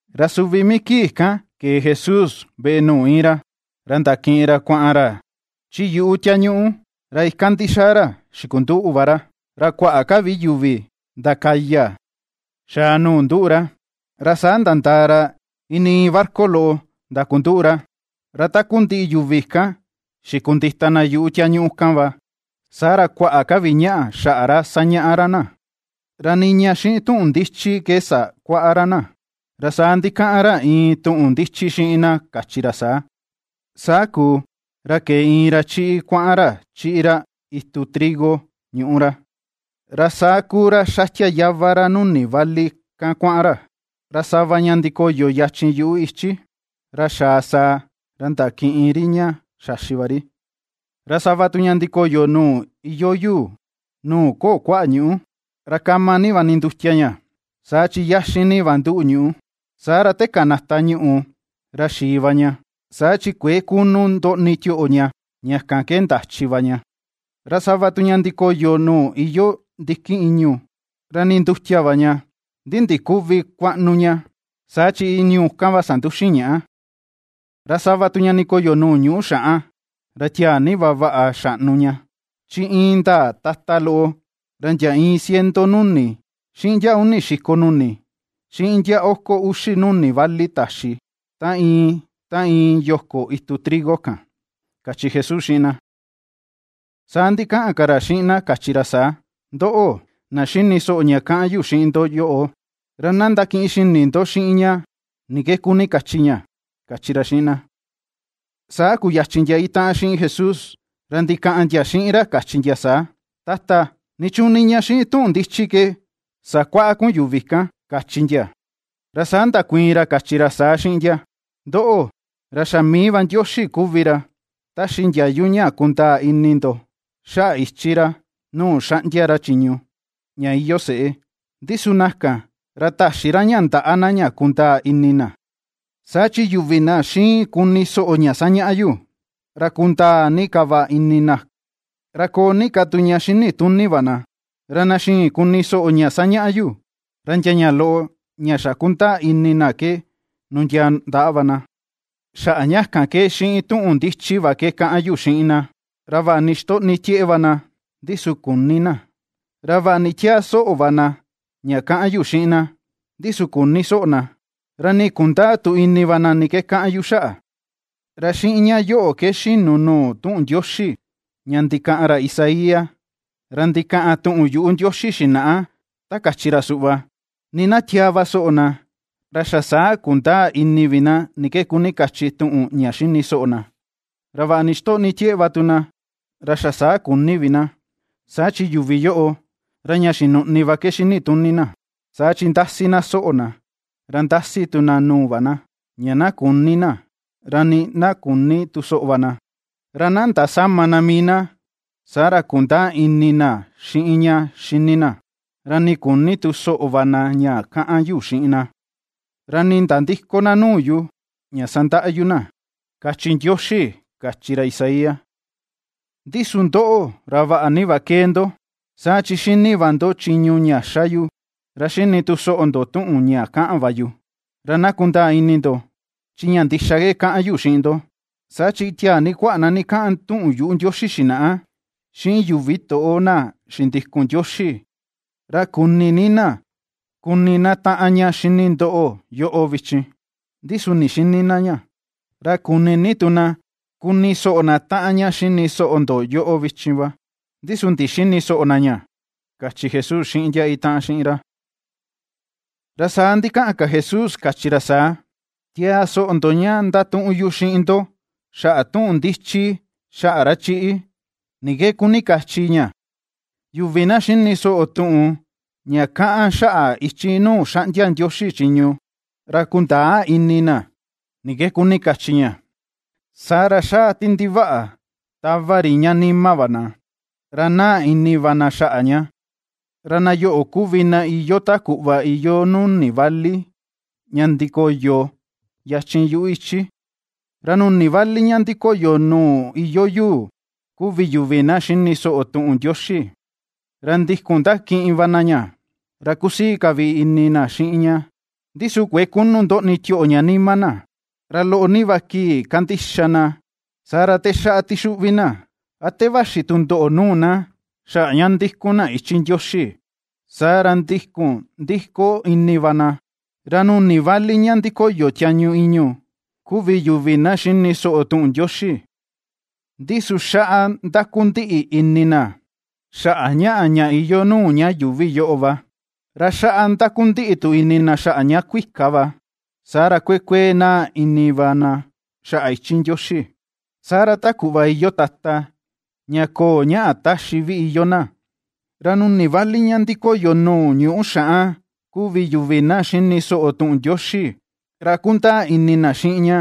Ra suvi mii kii kan kee Jesús veꞌe nuu íin ra, ra ndakiꞌin ra kuaꞌan ra chi yuꞌu tiañuꞌu, ra ikan ndixaa ra xikunduꞌu va ra. Ra kuaꞌa ka vi yuvi ndakaya xaa nuu nduꞌu ra, ra saa nandaa ra ini iin barca loꞌo ndakunduꞌu ra, ra takundiꞌi yuvi kan xikundita yuꞌu tiañuꞌu kan va. Saa ra kuaꞌa ka vi ña xaꞌa ra sañaꞌa ra na, ra niña xiꞌin tuꞌun ndichi ke sakuaꞌa ra na, ra saa ndikaꞌan ra iin tuꞌun ndichi xiꞌin na kachi ra saa: ―Saa kuu, ra kee iin ra chiꞌi kuaꞌan ra chiꞌi ra itu trigo ñuꞌu ra. Ra saa kuu ra xatia yava ra nuni vali kan kuaꞌan ra, ra sava ña ndikoyo yachin yuꞌu ichi, ra ^xaa sàà, ra ndakiꞌin ri ña xaxi va ri. Ra sava tu ña ndikoyo nuu iyoo yuu, nuu köo kuaꞌa ñuꞌú, ra kama ni va nindutia ña, saa chi yaxin ni va nduꞌu ñuꞌú. Saa ra te kanata ñuꞌù, ra xii va ña, saa chi kuëe kunu ndoꞌni tioꞌo ña, ña kan ke ndachi va ña. Ra sava tu ña ndikoyo nuu iyoo ndikin ìñu̱, ra nindutia va ña, ndi ndiküvi kuaꞌnu ña, saa chi ìñu̱ kan va sanduxin ñaꞌa. Ra sava tu ña ndikoyo nuu ñuꞌu xaꞌan, ra tiaa ni va vaꞌa xaꞌnu ña, chi indaa tata loꞌo, ra ndia iin ciento nuni, xiꞌin ndia uni xiko nuni, xiꞌin ndia oko uxi nuni vali taxi, ta iin ta iin yoko itu trigo kan ―kachi Jesús xiꞌin na Saa ndikaꞌan ka ra xiꞌin na kachi ra saa: ―Ndóꞌo̱, na xini soꞌo ña kaꞌan yu xiꞌin ndo yoꞌo, ra na ndakiꞌin xini ndo xiꞌin ña, ni ke kuni kachi ña ―kachi ra xiꞌin na. Saa kuyachin ndia itaꞌan xiꞌin Jesús, ra ndikaꞌan ndia xiꞌin ra kachi ndia saa: ―Tata, ¿nichuun niña xiꞌin tuꞌun ndichi ke sakuaꞌa kun yuvi kan? ―kachi ndia. Ra saa ndakuiin ra kachi ra saa xiꞌin ndia: ―Ndoꞌo, ra xa mii va Ndioxi kuvi ra ^taxi ndiayu ña na kundaa ini ndo xaꞌa ichi ra nuu xaꞌndia ra chiñu, ña iyoo seꞌé, ndi su na kan, ra täxi ra ña ndaꞌa na ña kundaa ini na. Saa chi yuvi na xiin kuni soꞌo ña sañaꞌa yu, ra kundaa ni ka va ini na, ra koo ni ka tu ña xini tuni va na; ra na xïin kuni soꞌo ña sañaꞌa yu, ra ndia ña loꞌo ña xa kundaa ini na ke nundiaa ndaꞌa va na. Xaꞌa ña kan ke xiꞌin tuꞌun ndichi va kaꞌan yu xiꞌin na; ra vaꞌa ni ixtoꞌni tieꞌe va na, ndi su küni na, ra vaꞌa ni tiaa soꞌo va na ña kaꞌan yu xiꞌin na, ndi su küni soꞌo na, ra nii kundäa tu ini va na ni ke kaꞌan yu xaꞌa. Ra xiꞌin ña yoꞌo ke xinu nuu tuꞌun Ndioxi ña ndikaꞌan ra Isaías, ra ndikaꞌan tuꞌun yuꞌu Ndioxi xinaꞌa, ta kachi ra suꞌva: Nii na tiaa ni va soꞌo na, ra xa saa kundäa ini vi na ni ke kuni kachi tuꞌun ña xini soꞌo na, ra vaꞌa ni ixtoꞌni tieꞌe va tu na, ra xa saa küni vi na. Saa chi yuvi yoꞌo: ra ña xinuꞌni va ke xinituni na, saa chi ^ndasi na soꞌo na, ra ^ndasi tu na nuu va na, ña na küni na, ra nii na küni tu soꞌo va na, ra na ndasäma na mii na, saa ra kundäa ini na xiꞌin ña xini na, ra küni tu soꞌo va na ña kaꞌan yu xiꞌin na, ra nii na nandïko na nuu yu, ña sandaꞌa yu na, kachi Ndioxi, kachi ra Isaías. ’Ndi su ndoꞌo ra vaꞌa ni va ^kee ndo, saa chi xini va ndo chiñu ña xa yu, ra xini tu soꞌo ndo tuꞌun ña kaꞌan va yu. Ra na kundaa ini ndo, chi ña ndixa ke kaꞌan yu xiꞌin ndo, saa chi tiaa ni kuaꞌa na ndikaꞌan tuꞌun yuꞌu Ndioxi xinaꞌa, xiꞌin yuvi toꞌo na xindikun Ndioxi, ra kuni ni na kuni na taꞌan ña ^xini ndo yoꞌo vichin, ndi su ndixïni na ña; ra kuni ni tu na kuni soꞌo na taꞌan ña ^xini soꞌo ndo yoꞌo vichin va, ndi su ndixïni soꞌo na ña ―kachi Jesús xiꞌin ndia itaꞌan xiꞌin ra. Ra saa ndikaꞌan ka Jesús kachi ra saa: ―Tiaa soꞌo ndo ña ndatuꞌun yu xiꞌin ndo xaꞌa tuꞌun ndichi xaꞌa ra chiꞌi, ni ke kuni kachi ña. Yuvi na xini soꞌo tuꞌun ña kaꞌan xaꞌa ichi nuu xaꞌndia Ndioxi chiñu, ra kundäa ini na ni ke kuni kachi ña, saa ra xaa ti ndivaꞌa tava ri ña nima va na, ra naa ini va na xaꞌa ña. Ra na yoꞌo kuvi na iyoo ta kuꞌva iyoo nuni vali ña ndikoyo yachin yuꞌu ichi. Ra nuni vali ña ndikoyo nuu iyoo yuu, kuvi yuvi na xini soꞌo tuꞌun Ndioxi, ra ndikun ndakiꞌin va na ña, ra kusii ka vi ini na xiꞌin ña. Ndi su kuëe kunu ndoꞌni tioꞌo ña nima na, ra loꞌo ni va kii kandixa na, saa ra te xaꞌa tixuꞌvi na, a te vaxi tundoꞌo nuu na xaꞌa ña ^ndíku̱n na ichi Ndioxi, saa ra ndikun ndiko ini va na. Ra nuni vali ña ndikoyo tiañu ìñu̱ kuvi yuvi na xini soꞌo tuꞌun Ndioxi, ndi su xaꞌa ndakundiꞌi ini na xaꞌa ñaꞌa ña iyoo nuu ña yuuvi yoꞌo va, ra xaꞌa ndakundiꞌi tu ini na xaꞌa ña kuika va. Saa ra kuee kuee naa ini va na xaꞌa ichi Ndioxi, saa ra ta kuꞌva iyoo tata ña köo ñaꞌa taxi vi iyoo na. Ra nuni vali ña ndikoyo nuu ñuꞌu xaꞌan kuvi yuvi na xini soꞌo tuꞌun Ndioxi, ra kundaa ini na xiꞌin ña,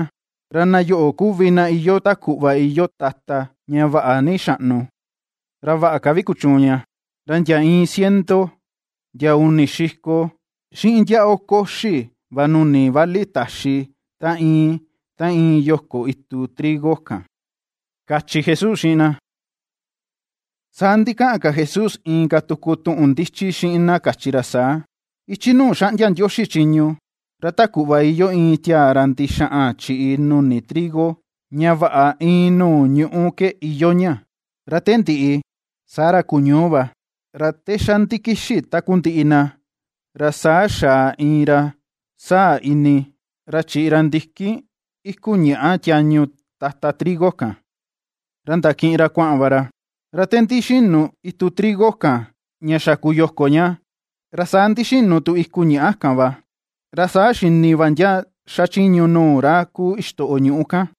ra na yoꞌo kuvi na iyoo ta kuꞌva iyoo tata ña vaꞌa ni xaꞌnu, ra vaꞌa ka vi kuchuun ña, ra ndia iin ciento, ndia uni xiko, xiꞌin ndia oko uxi va nuni vali taxi ta iin ta iin yoko itu trigo kan ―kachi Jesús xiꞌin na. Saa ndikaꞌan ka Jesús inka tuku tuꞌun ndichi xiꞌin na kachi ra saa: ―Ichi nuu xaꞌndia Ndioxi chiñu, ra ta kuꞌva iyoo iin tiaa ra ndixaꞌan chiꞌi nuni trigo ña vaꞌa iin nuu ñuꞌu ke iyoo ña. Ra te ndiꞌi, saa ra kuñuu va, ra te xa ndikixi takundiꞌi na, ra saa xaa iin ra sáa̱̱ ini, ra chiꞌi ra ndikin iku ñàꞌa tiañu tata trigo kan, ra ndakiꞌin ra kuaꞌan va ra. Ra te ndixinu itu trigo kan ña xa kuyoko ña, ra saa ndixinu tu iku ñàꞌa kan va, ra saa xini va ndia xachiñu nuu ra kuu ixtoꞌo ñuꞌu kan.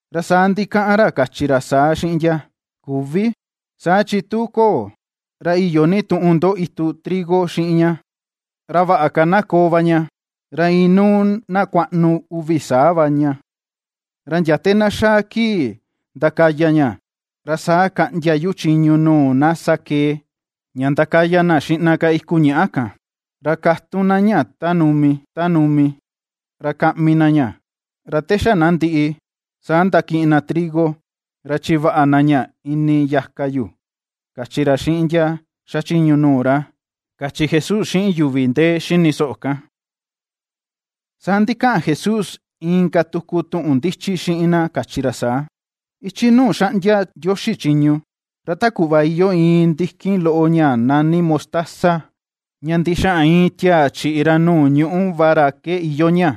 Ra saa ndikaꞌan ra kachi ra saa xiꞌin ndia: “Küvi, saa chi tu köo, ra iyo ni tuꞌun ndo itu trigo xiꞌin ña. Ra vaꞌa ka na koo va ña, ra inuu na kuaꞌnu uvi saa va ña, ra ndia te na xaa kii ndakaya ña, ra saa kaꞌndia yu chiñu nuu na sakee, ña ndakaya na xiꞌna ka iku ñàꞌa kan, ra katun na ña ta numi ta numi, ra kaꞌmi na ña; ra te xa na ndiꞌi, saa ndakiꞌin na trigo, ra chivaꞌa na ña ini yaka yu”, kachi ra xiꞌin ndia xachiñu nuu ra ―kachi Jesús xiꞌin yuvi ndee xini soꞌo kan. Saa ndikaꞌan Jesús inka tuku tuꞌun ndichi xiꞌin na kachi ra saa: ―Ichi nuu xaꞌndia Ndioxi chiñu, ra ta kuꞌva iyoo iin ndikin loꞌo ña nani mostaza ña ndixaꞌan iin tiaa chiꞌi ra nuu ñuꞌu va ra ke, iyoo ña.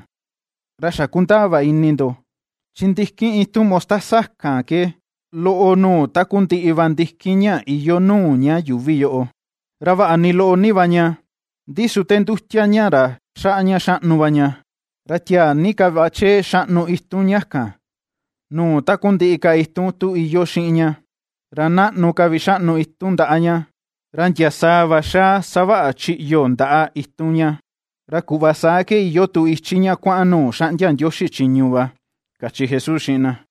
Ra xa kundaa va ini ndo, chi ndikin itun mostaza kan ke loꞌo nuu takundiꞌi va ndikin ña iyoo nuu ña yuuvi yoꞌo; ra vaꞌa ni loꞌo ni va ña, ndi su te ndutia ña ra xaꞌa ña xaꞌnu va ña, ra tiaa ni ka va chee xaꞌnu itun ña kan nuu takundiꞌi ka itun tu iyoo xiꞌin ña; ra naꞌnu ka vi xaꞌnu itun ndaꞌa ña, ra ndia sàà va xáá ^xavaꞌa chiꞌyo ndaꞌa itun ña. Ra kuꞌva saa ke iyoo tu ichi ña kuaꞌan nuu ^xaꞌndia Ndioxi chiñu va ―kachi Jesús xiꞌin na.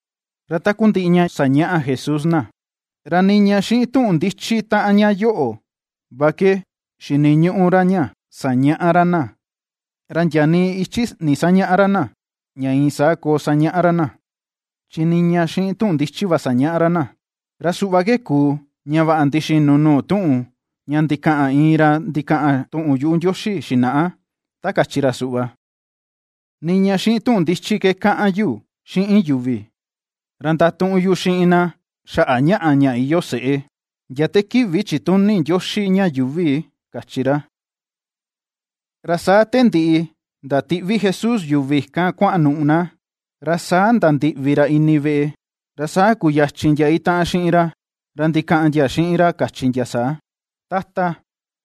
Ra takundiꞌi ña sañaꞌa Jesús na, ra niña xiꞌin tuꞌun ndichi taꞌan ña yoꞌo va ke xiniñuꞌu ra ña sañaꞌa ra na. Ra ndia nii ichi ndisañäꞌa ra na ña iin saa koo sañaꞌa ra na, chi niña xiꞌin tuꞌun ndichi va ke sañaꞌa ra na. Ra suꞌva ke kuu ña vaꞌa ndixinu nuu tuꞌun ña ndikaꞌan iin ra ndikaꞌan tuꞌun yuꞌu Ndioxi xinaꞌa ta kachi ra suꞌva: Niña xiꞌin tuꞌun ndichi ke kaꞌan yu xiꞌin yuvi, ra ndatuꞌun yu xiꞌin na xaꞌa ñaꞌa ña iyoo seꞌé, ndia te kivi chituni Ndioxi ña yuuvi, kachi ra. Ra saa te ndiꞌi ndatiꞌvi Jesús yuvi kan kuanuꞌu na, ra saa nandiꞌvi ra ini veꞌe, ra saa kuyachin ndia itaꞌan xiꞌin ra, ra ndikaꞌan ndia xiꞌin ra kachi ndia saa: ―Tata,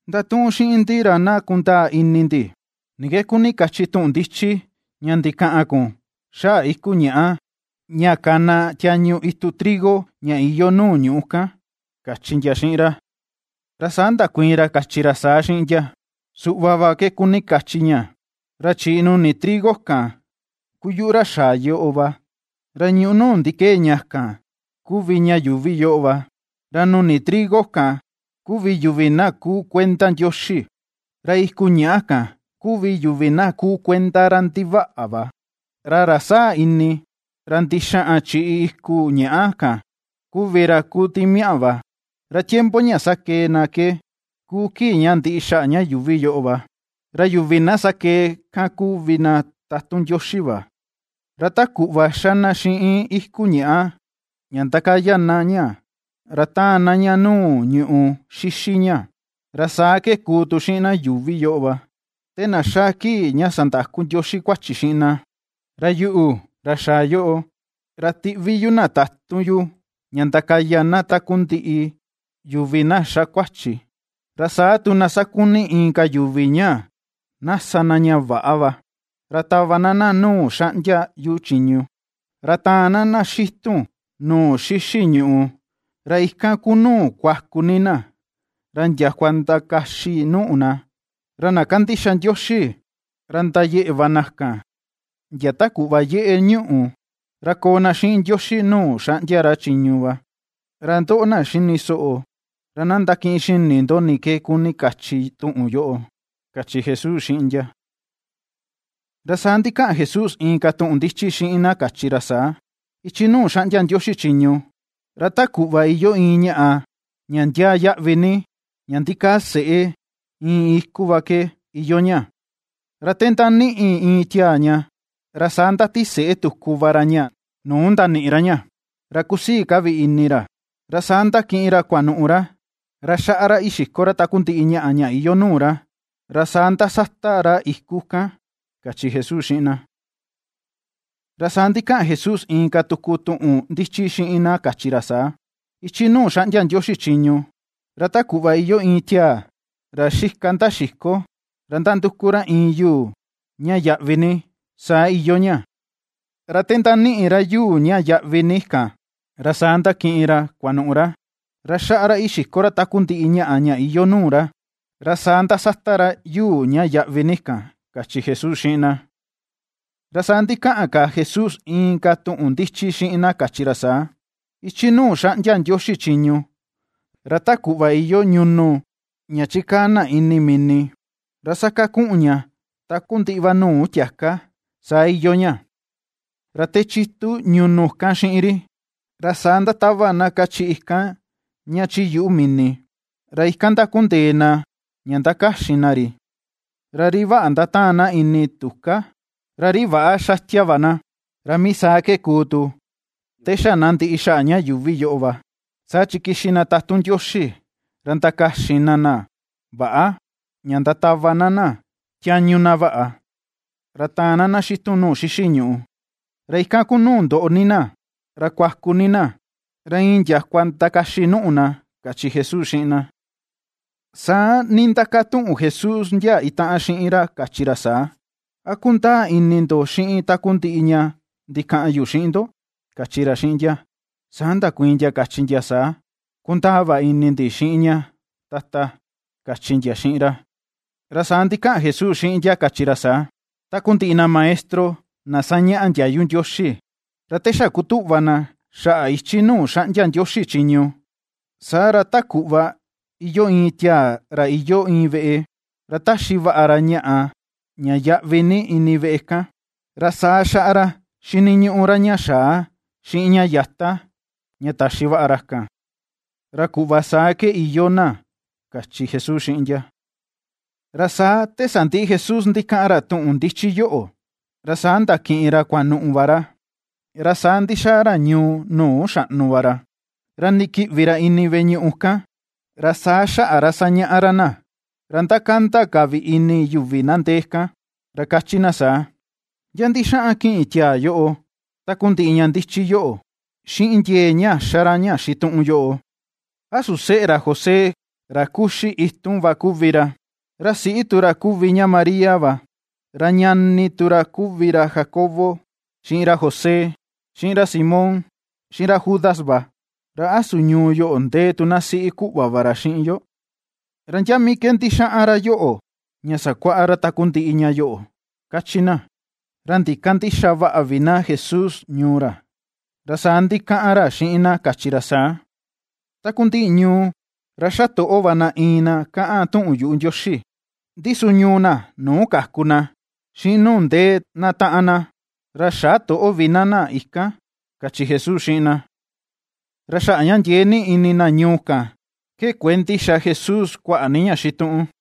ndatuꞌun xiꞌin ndi ra na kundaa ini ndi, ni ke kuni kachi tuꞌun ndichi ña ndikaꞌan kun xaꞌa iku ñàꞌa ña kana tiañu itu trigo ña iyoo nuu ñuꞌu kan ―kachi ndia xiꞌin ra. Ra saa ndakuiin ra kachi ra saa xiꞌin ndia: ―Suꞌva va ke kuni kachi ña: ra chiꞌi nuni trigo kan ku yuꞌu ra xaa yoꞌo va; ra ñuꞌu nuu ndikee ña kan kuvi ña yuuvi yoꞌo va, ra nuni trigo kan kuvi yuvi na kuu kuenda Ndioxi, ra iku ñàꞌa kan kuvi yuvi na kuu kuenda ra ndivaꞌa va. Ra ra sáa̱̱ ini, ra ndixaꞌan chiꞌi iku ñàꞌa kan kuvi ra kuu timiaꞌa va. Ra tiempo ña sakee na ke kuu kii ña ndiꞌi xaꞌa ña yuuvi yoꞌo va; ra yuvi na sakee kan kuvi na tatun Ndioxi va. Ra ta kuꞌva ^xa na xiꞌin iku ñàꞌa, ña ^ndakaya na ña, ra ^taan na ña nuu ñùꞌù xixi ña, ra saa ke kuu tu xiꞌin na yuuvi yoꞌo va, te na xaa kii ña sandaku Ndioxi kuachi xiꞌin na. Ra yuꞌu, ra xaa yoꞌo, ra tiꞌvi yu na tatun yu ña ndakaya na takundiꞌi yuvi na ^xa kuachi, ra saa tu na sakuni inka yuvi ña na sa na ña väꞌa va, ra tava na na nuu xaꞌndia yu chiñu, ra taan na na xitun nuu xixi ñùꞌù, ra ikan ku nuu kuaku ni na, ra ndiakua ndakaxi nuꞌu na. Ra na kandixa Ndioxi, ra ndayeꞌe va na kan ndia ta kuꞌva yeꞌe ñuꞌù, ra koo na xiꞌin Ndioxi nuu xaꞌndia ra chiñu va. Ra ndoꞌo, na xini soꞌo, ra na ndakiꞌin xini ndo ni ke kuni kachi tuꞌun yoꞌo ―kachi Jesús xiꞌin ndia. Ra saa ndikaꞌan Jesús inka tuꞌun ndichi xiꞌin na kachi ra saa: ―Ichi nuu xaꞌndia Ndioxi chiñu, ra ta kuꞌva iyoo iin ñaꞌa ña ndiaa yaꞌvi ni ña ndikaa seꞌe iin iku va ke, iyoo ña. Ra te ^ndaniꞌi iin tiaa ña, ra saa ndatiseꞌe tuku va ra ña nuu ndaniꞌi ra ña; ra kusii ka vi ini ra, ra saa ndakiꞌin ra kuanuꞌu ra, ra xaꞌa ra ixiko ra takundiꞌi ñaꞌa ña iyoo nuu ra, ra saa ndasata ra iku kan ―kachi Jesús xiꞌin na. Ra saa ndikaꞌan Jesús inka tuku tuꞌun ndichi xiꞌin na kachi ra saa: ―Ichi nuu xaꞌndia Ndioxi chiñu, ra ta kuꞌva iyoo iin tiaa ra xika ndaxiko, ra nanduku ra iin yuu ña yaꞌvi ni, saa iyoo ña. Ra te ^ndaniꞌi ra yuu ña yaꞌvi ni kan, ra saa ndakiꞌin ra kuanuꞌu ra, ra xaꞌa ra ixiko ra takundiꞌi ñaꞌa ña iyoo nuu ra, ra saa ndasata ra yuu ña yaꞌvi ni kan ―kachi Jesús xiꞌin na. Ra saa ndikaꞌan Jesús inka tuꞌun ndichi xiꞌin na kachi ra saa: ―Ichi nuu xaꞌndia Ndioxi chiñu, ra ta kuꞌva iyoo ñunu ña chikaa na ini mini ra sakakuꞌun ña takundiꞌi va nuu tiaka, saa iyoo ña. Ra te chitu ñunu kan xiꞌin ri, ra saa ndatava na kachiꞌi kan ña chi yuꞌu mini, ra ikan ndakundee na ña ndakaxin na ri; ra ri vaꞌa ndataan na ini tuká, ra ri väꞌa xatia va na. Ra mii saa ke kuu tu te xa na ndiꞌi xaꞌa ña yuuvi yoꞌo va; saa chi kixi na tatun Ndioxi ra ndakaxin na na väꞌa ña ndatava na na tiañu na vaꞌa. Ra taan na na xitun nuu xixi ñùꞌù. Ra ikan kuu nuu ndoꞌo ni na, ra kuaku ni na, ra iin ndiakua ndakaxi nùꞌù na ―kachi Jesús xiꞌin na. Saa nindakatuꞌun Jesús ndia itaꞌan xiꞌin ra kachi ra saa: ―¿A kundaa ini ndo xiꞌin takundiꞌi ña ndikaꞌan yu xiꞌin ndo? ―kachi ra xiꞌin ndia. Saa ndakuiin ndia kachi ndia saa: ―Kundaa va ini ndi xiꞌin ña, Tata ―kachi ndia xiꞌin ra. Ra saa ndikaꞌan Jesús xiꞌin ndia kachi ra saa: ―Takundiꞌi na maestro na sañaꞌa ndiayu Ndioxi, ra ta xa kutuꞌva na xaꞌa ichi nuu xaꞌndia Ndioxi chiñu, saa ra ta kuꞌva iyoo iin tiaa ra iyoo iin veꞌe, ra taxi vaꞌa ra ñaꞌa ña yaꞌvi ni ini veꞌe kan, ra saa xaꞌa ra xiniñuꞌu ra ña xaa xiꞌin ña yata, ña taxi vaꞌa ra kan, ra kuꞌva saa va ke iyoo na ―kachi Jesús xiꞌin ndia. Ra saa te sandiꞌi Jesús ndikaꞌan ra tuꞌun ndichi yoꞌo, ra saa ndakiꞌin ra kuanuꞌu va ra, ra saa ndixaa ra ñuu nuu xaꞌnu ra. Ra ndikiꞌvi ra ini veꞌe ñuꞌu ñuu kan ra saa xaꞌa ra sañaꞌa ra na, ra ndakanda ka vi ini yuvi na ndee kan, ra kachi na saa: ―¿Ndia ndixaꞌan kiꞌin tiaa yoꞌo takundiꞌi ña ndichi yoꞌo, xiꞌin ndiee ña xa ra ña xituꞌun yoꞌo? ¿A su seꞌe ra José ra kuxi itun va kuvi ra, ra siꞌi tu ra kuvi ña María va, ra ñani tu ra kuvi ra Jacobo, xiꞌin ra José, xiꞌin ra Simón, xiꞌin ra Judas va? ¿Ra a su ñuu yoꞌo ndee tu na siꞌi kuꞌva va ra xiꞌin yo? ¿Ra ndia mii ke ndixaꞌan ra yoꞌo ña sakuaꞌa ra takundiꞌi ña yoꞌo? ―kachi na. Ra ndikandïxa vaꞌa vi na Jesús ñuu ra, ra saa ndikaꞌan ra xiꞌin na kachi ra saa: ―Takundiꞌi ñuu ra ^xa toꞌo va na iin na kaꞌan tuꞌun yuꞌu Ndioxi, ndi su ñuu na nuu kaku na, xiꞌin nuu ndee na taꞌan na, ra xä toꞌo vi na na ikan ―kachi Jesús xiꞌin na. Ra xaꞌa ña ndiee ni ini na ñuu kan ke kuëe ndixa Jesús kuaꞌa ni ña xituꞌun.